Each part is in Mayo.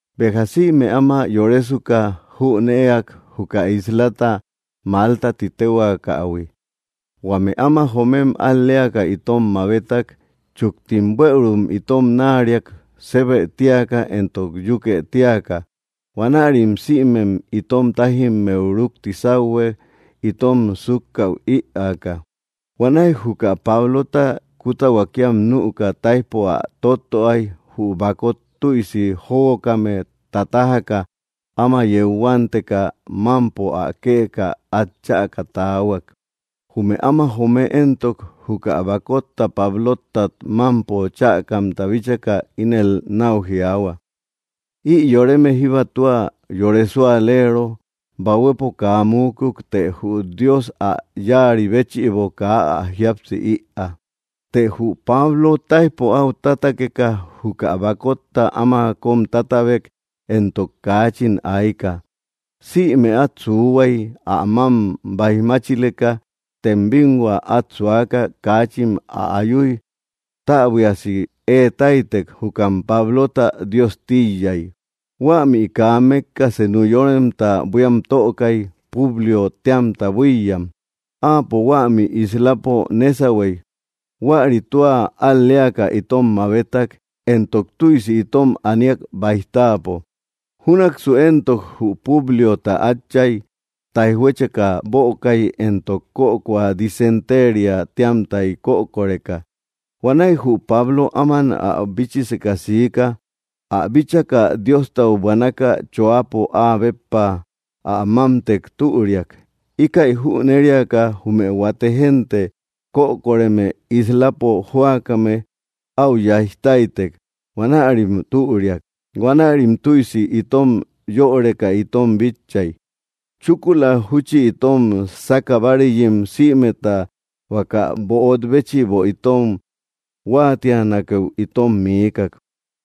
Béja sïme áma yorésuka, jünëeak juka íslata Malta ti téhuaakähui. Huame áma joomem al‑léaka itom mabétak. Sejchúktim bueürum itom náariak sébë tíaka éntok yúkë tíaka. Huanärim sïmem itom tájimmeu rukti sauhue itom sukäu ïaaka. Huanäi juka Pablota kuta huakíam nüka taijpo ä tóttöai, jü bakot tüisi jóguokame tatájaka áma yeu huánteka mampo ä këka at chäka taahuak. Jume áma joome éntok, juka bakotta Pablótat mampo chäkamta bíchaka ínel nau jiaahua: —Ï yoreme jíba tua yore súaleero. Bahuepo kaa muukuk, të jü Dios ä yáari béchïbo kaa ä jíapsï ïaa. Të jü Pablo táijpo au tátakeka juka bakotta áma kom tátabek éntok kaachin aika. Sïme at suuhuai ä mam baijmáchileka. Tem binhua at suaka, kaachin ä ayúi, täbuiasi eetáitek. Jukam Pablota dios tíiyai. Huämi kaa mekka senu yoremta buíam tökai, Públiö téamta buíyam. Áapo huämi islapo nésauhuei. Huäri tua al‑léaka itom mabétak, éntok tüisi itom aníak baij táapo. Júnaksu éntok, jü Públiota átchay taijhuécheka bökai éntok kökoa disentériä téamtai kökoreka. Huanäi jü Pablo áman ä bíchiseka siika. Ä bíchaka, Diostau buanaka choápo áa béppa ä mámtek türiak. Íkäi jüneriaka jume huate génte kökoreme islapo jóakame au yaij táitek; huanärim türiak. Huanärim tüisi itom yöreka itom bitchai. Chúkula júchi itom saka báareyim sïmeta huaka böot béchïbo itom huáatianakeu itom miikak.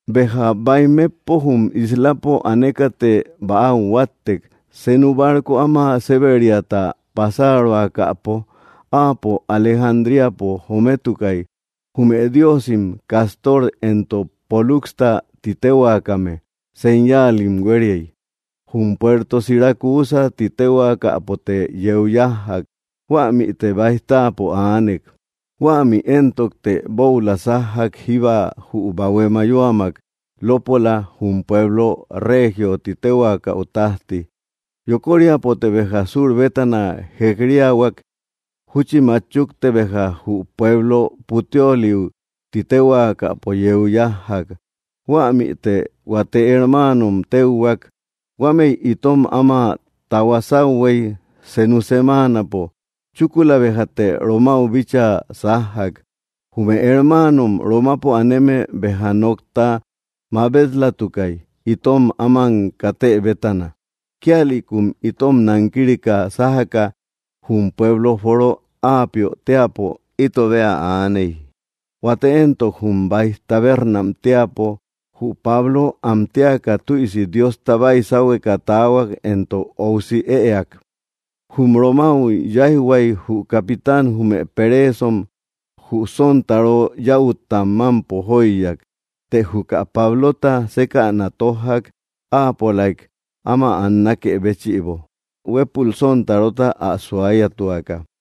Béja baij metpo jum islapo anékate bäau huáttek senu barco áma séberiata pasároakäpo. Áapo Alejandríapo jométukai, jume diósim Cástor éntok Póluxta titéhuaakame señáalim huériai. Jum puerto Siracúsä ti téhuakapote yeu yájjak. Huämite baij táapo aanek. Huämi éntokte boula sájjak jíba jü bahué mayóamak lópola jum pueblo Reegiö ti téhuakäu tajti. Yokóriapote béja sur bétana jekríahuak, júchi machukte béja jü pueblo Puteólï ti téhuakapo yeu yájjak. Huämite huate hermáanom téuhuak. Huámëi itom áma tahuá sauhuei senu semáanapo. Chúkula béjate Romáu bíchaa sájjak. Jume hermaanom Romapo aneme béja nokta mabet‑latukay, itom áman katë bétana. Kíalïkum itom nankírika sájaka jum pueblo Foro Aapiö teäpo ito bea aaney, huate éntok, jum Baij Tabérnam teäpo. Jü Pablo am téaka tüisi Diosta baisáuhueka taahuak éntok óusi ëak. Jum Romáu yáijhuak jü capitán jume peréesom jü sontaró yäutta mampo jóiyak. Të juka Pablota sékäna tójjak áapolaik áma annákë béchïbo, huépul sontarota ä suáyatuaka.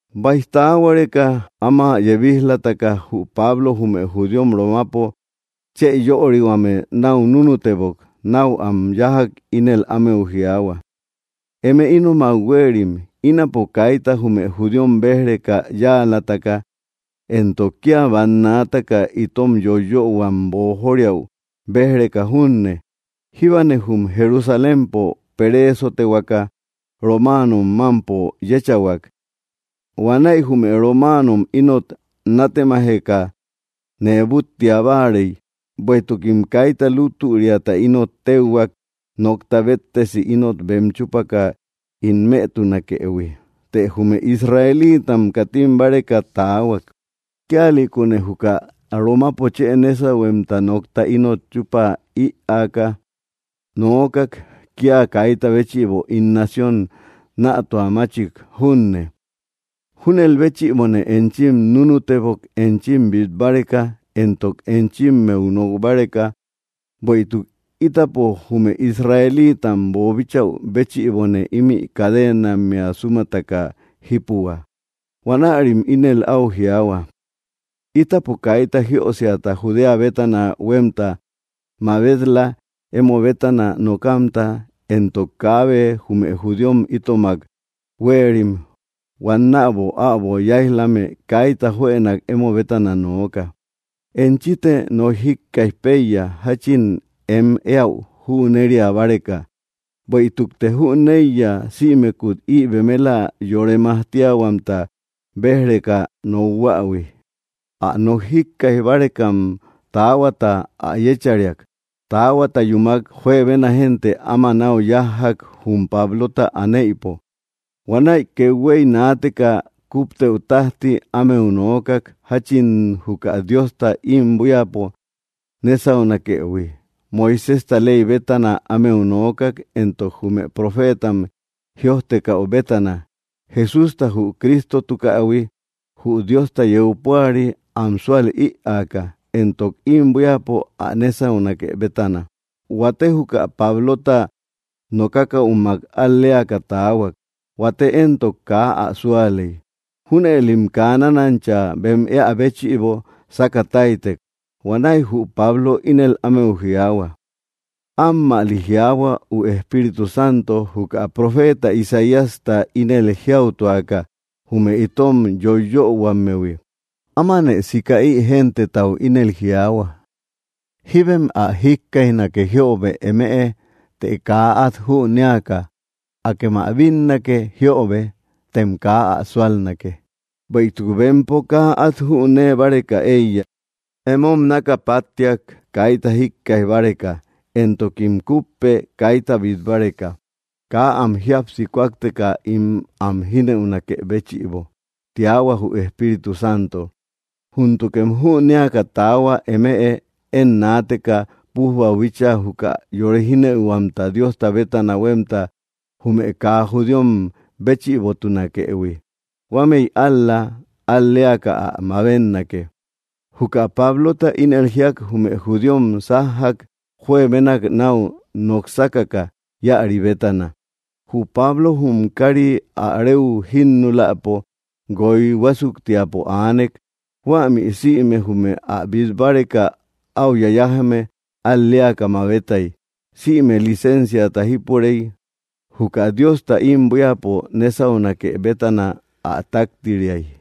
Baij taáhuareka áma yebíj‑lataka jü Pablo jume judíom Romapo chë yörihuame nau núnutebok. Nau am yájak, ínel ámeu jiaahua: —Eme ínomak huéerim, ínapo kaita jume judíom béj‑reka yáalataka, éntok kia bannaataka itom yóiyöhuam boojóriäu béj‑reka junne, jíbane jum Jerusalémpo peréesotehuaka romáanom mampo yéchahuak. Huanäi jume romáanom ínot nátemajeka nee búttia báarei, bueïtukim kaita lútüriata ínot téuhuak nokta béttesi ínot bem chúpaka ín mëtunakëhui. Të jume Israelitam katim báreka taahuak. Kíalïkune juka Romapo chë nésauhuemta nokta ínot chupa ïaka nookak, kia kaita béchïbo ín nación nätuamáchik junne. Júnel béchïbone enchim núnutebok enchim bit báreka éntok enchimmeu nok báreka; bueïtuk ítapo jume Israelítam boobíchäu béchïbone imi cadenammea súmataka jípuhua. Huanärim ínel au jiaahua: —Ítapo kaita jiösiata Judea bétana huemta mabet‑la emo bétana nokamta, éntok kaabe jume judíom itomak huéerim huannäbo äbo yáij‑lame kaita juënak emo bétana nooka. Enchite nok jíkkaij peiya jachin em éäu jünéria báreka, bueïtukte jüneiya sïmekut ï bemela yore majtíahuamta béj‑reka nokhuähui. Ä nok jíkkaij bárekam taáhuata ä yéchariak. Taáhuata yúmak, juebena génte áma nau yájjak jum Pablota anéïpo. Huanäi kethuéi naateka kúptëu tajti ámeu noókak jachin juka Diosta im buíapo nésaunakëhui. Moiséjta ley bétana ámeu noókak, éntok jume profétam jïojtekäu bétana, Jesústa jü Crístotukähui, jü Diosta yeu púari, am súal ïaaka, éntok im buíapo ä nésaunake bétana. Huate juka Pablota nokákäumak al‑léaka taahuak, huate éntok, kaa ä súalei. Júnëlim kaa nánancha bem éä béchïbo sáka táitek. Huanäi jü Pablo ínel ámeu jiaahua: —Ammäli jiaahua jü Espíritu Santo juka profeta Isaíasta ínel jiáutuaka jume itom yóiyöhuammehui: Ámanë sika ï gentetau ínel jiaahua: Jíbem ä jikkaijnake jiöbe eme, të kaa at jünéaka; akém ä bínnake jiöbe, tem kaa ä súalnake. Bueïtuk bempo kaa at jünee báreka eiya. Emom naka páttiak kaita jíkkaij báreka, éntokim kúpek kaita bit báreka, kaa am jíapsi kúakteka ín am jínëunakë béchïbo, tiahua jü Espíritu Santo. Júntukem jünéaka taáhua eme, én naateka pujbau bíchaa juka yore jínëihuamta Diosta bétana huemta jume kaa judíom béchïbotunakëhui. Huámëi ál‑la al‑léaka ä mabénnake. Juka Pablota ínel jíak, jume judíom sájjak juebénak nau noksákaka íäri bétana. Jü Pablo jum kári ä reu jínulapo guoy huásuktiapo aanek. Huämi sïme jume ä bít báreka áu yayájame al‑leaka mabetay. Sïme licenciata jípurey, juka Diosta ím buíapo nésaunake bétana kaabe ä táktiriay.